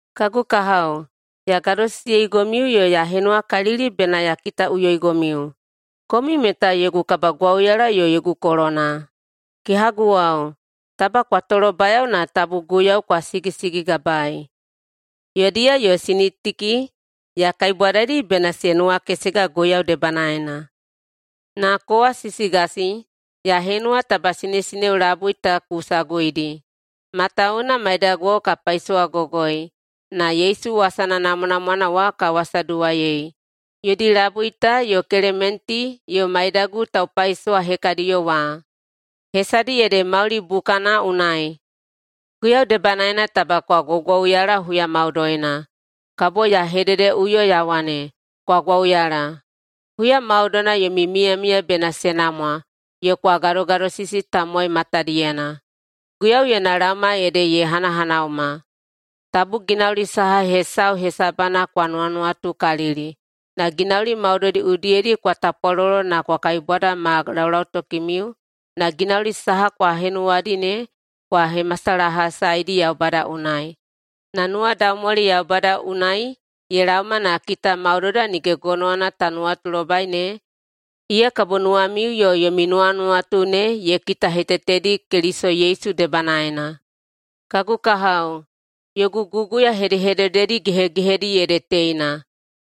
Kagu kahao, ya gadosisiyeigomiu yo ya henuwakalili bena ya kitaꞌuyoigomiu. Komiu meta yogu kabagwauyala yo yogu kolona. Kehaguwao, taba kwa tolobayao na tabu Guiyau kwa sigisigigabaei. Yodiya yo Sinitiki ya kaibwadaidi bena se nuwakesega Guiyau debanaena. Na kowa, Sisigasi, ya henuwa taba sinesineo labui ta ku saguidi, matawuwuna maidaguwao ka paisowagogoi na Yesu wasana namwanamwana wa ka wasaduwaiyei – yodi labui ta yo Kelementi yo maidagu taupaisowa hekadiyo wa. Hesadi ede mauli bukana unai. Guiyau debanaena taba kwa gwaugwauyala huya maudoina. Kabo ya hededeꞌuyoi ya wane, kwa gwauyala. Huya maudoina yomi miyamiya bena se namwa yo kwa gadogadosisi tamowai matadiyena. Guiyau yona laoma ede ye hanahanauma. Tabu ginauli saha hesau hesabana kwa nuwanuwatukalili, na ginauli maudoidi udiyedi kwa tapwalolo na kwa kaibwada ma laulautokimiu na ginauli saha kwa henuwadi ne kwa hemasalahasaeidi Yaubada unai. Na nuwadaumwali Yaubada unai ye laoma na kita maudoida nige gonowana ta nuwatulobai ne, iya kabo nuwamiu yo yomi nuwanuwatu ne ye kitahetetedi Keliso Yesu debanaena. Kagu kahao, yogu guguya hedehedededi gehegehedi ede teina: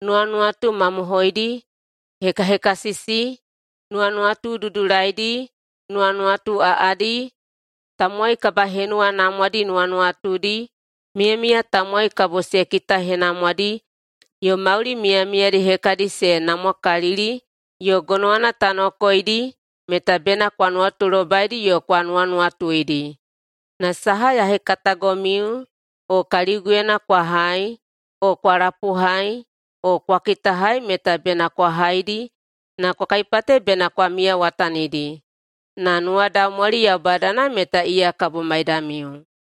Nuwanuwatu mamohoidi, hekahekasisi, nuwanuwatu dudulaidi, nuwanuwatu aꞌadi, tamowai kabahenuwanamwadi nuwanuwatudi, miyamiya tamowai kabo se kitahenamwadi, yo mauli miyamiyadi hekadi se namwakalili yo gonowana ta nokoeidi, meta bena kwa nuwatulobaidi yo kwa nuwanuwatuidi. Na saha ya hekatagomiu o kaliguyena kwa hai o kwa lapuhai o kwa kitahai meta bena kwa haidi na kwa kaipate bena kwa miyawatanidi. Na nuwadaumwali Yaubadana meta iya kabo maidamiu.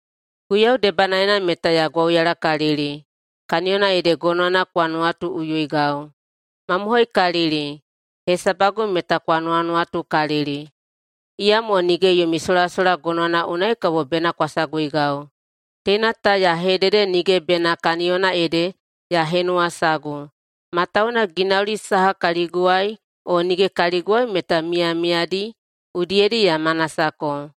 Guiyau debanaena meta ya gwauyalakalili, kaniyona ede gonowana kwa nuwatuiꞌuyoigau. Mamohoikalili, hesabagu meta kwa nuwanuwatukalili, iyamo nige yomi solasola gonowana unai kabo bena kwa saguigau. Teina ta ya hedede nige bena kaniyona ede ya henuwasagu, matawuwuna ginauli saha kaliguwai o nige kaliguwai meta miyamiyadi udiyedi ya manasako.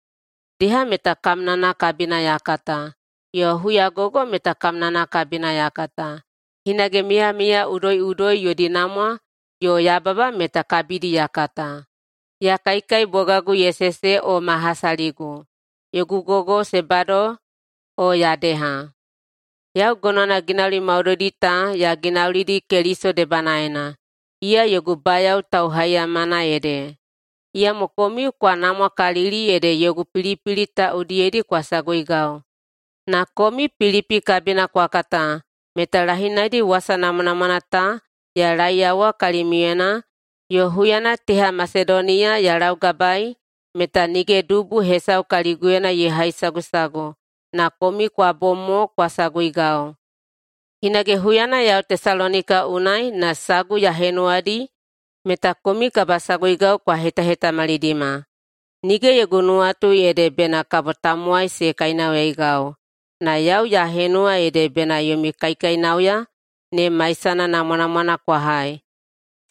Deha meta kamnana kabina ya kata, yo huyagogo meta kamnana kabina ya kata. Hinage miyamiya udoiꞌudoi yodi namwa yo yababa meta kabidi ya kata, ya kaikai bogagu ye sese o ma hasaligu, yogu gogo se bado o ya deha. Yau gonowana ginauli maudoidi ta ya ginaulidi Keliso debanaena, iya yogu bayao tauhaiyamana ede. Iyamo komiu kwa namwakalili ede yogu pilipili ta udiyedi kwa saguigau. Na komiu Pilipi kabina kwa kata meta lahinaidi wasa namwanamwana ta ya laeiyawa kalimiuyena yo huyana teha Masedoniya ya laugabaei meta nige dubu hesau kaliguyena ye haisagusagu na komiu kwa bom mo kwa saguigau. Hinage huyana yau Tesalonika unai na sagu ya henuwadi meta komiu kabasaguigau kwa hetahetamalidima. Nige yogu nuwatu ede bena kabo tamowai se kainauyaigau, na yau ya henuwa ede bena yomi kaikainauya ne maisana namwanamwana kwa hai.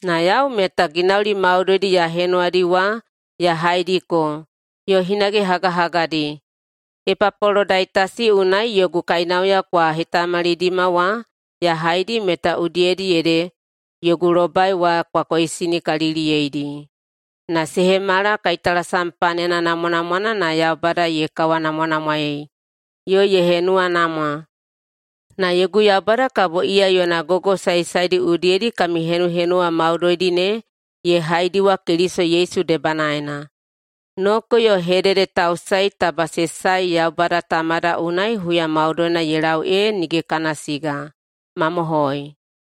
Na yau meta ginauli maudoidi ya henuwadi wa ya haidiko yo hinage hagahagadi. Epapolodaitasi unai yogu kainauya kwa hetamalidima wa ya haidi meta udiyedi ede yogu lobai wa kwa koisinikaliliyeidi. Na se hemala kaitalasam panena namwanamwana na Yaubada ye kawanamwanamwaei yo ye henuwanamwa. Na yogu Yaubada kabo iya yona gogo saesaedi udiyedi kami henuhenuwa maudoidi ne ye haidiwa Keliso Yesu debanaena. Noko yo hededetausae taba se sae Yaubada Tamada unai huya maudoina ye lau ee nige kana siga. Mamohoi.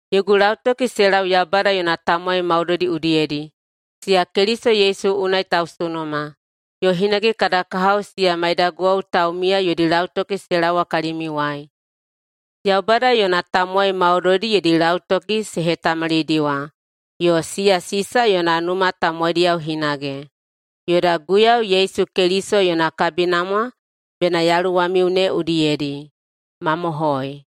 Yogu lautoki se lau Yaubada yona tamowai maudoidi udiyedi, siya Keliso Yesu unai tausunuma. Yo hinage kada kahao siya maidaguwao taumiya yodi lautoki se laowa kalimiuwai. Yaubada yona tamowai maudoidi yodi lautoki se hetamalidiwa yo siya Sisa yona numa tamowaidiyao hinage. Yoda Guiyau Yesu Keliso yona kabinamwa bena yaluwamiu ne udiyedi. Mamohoi.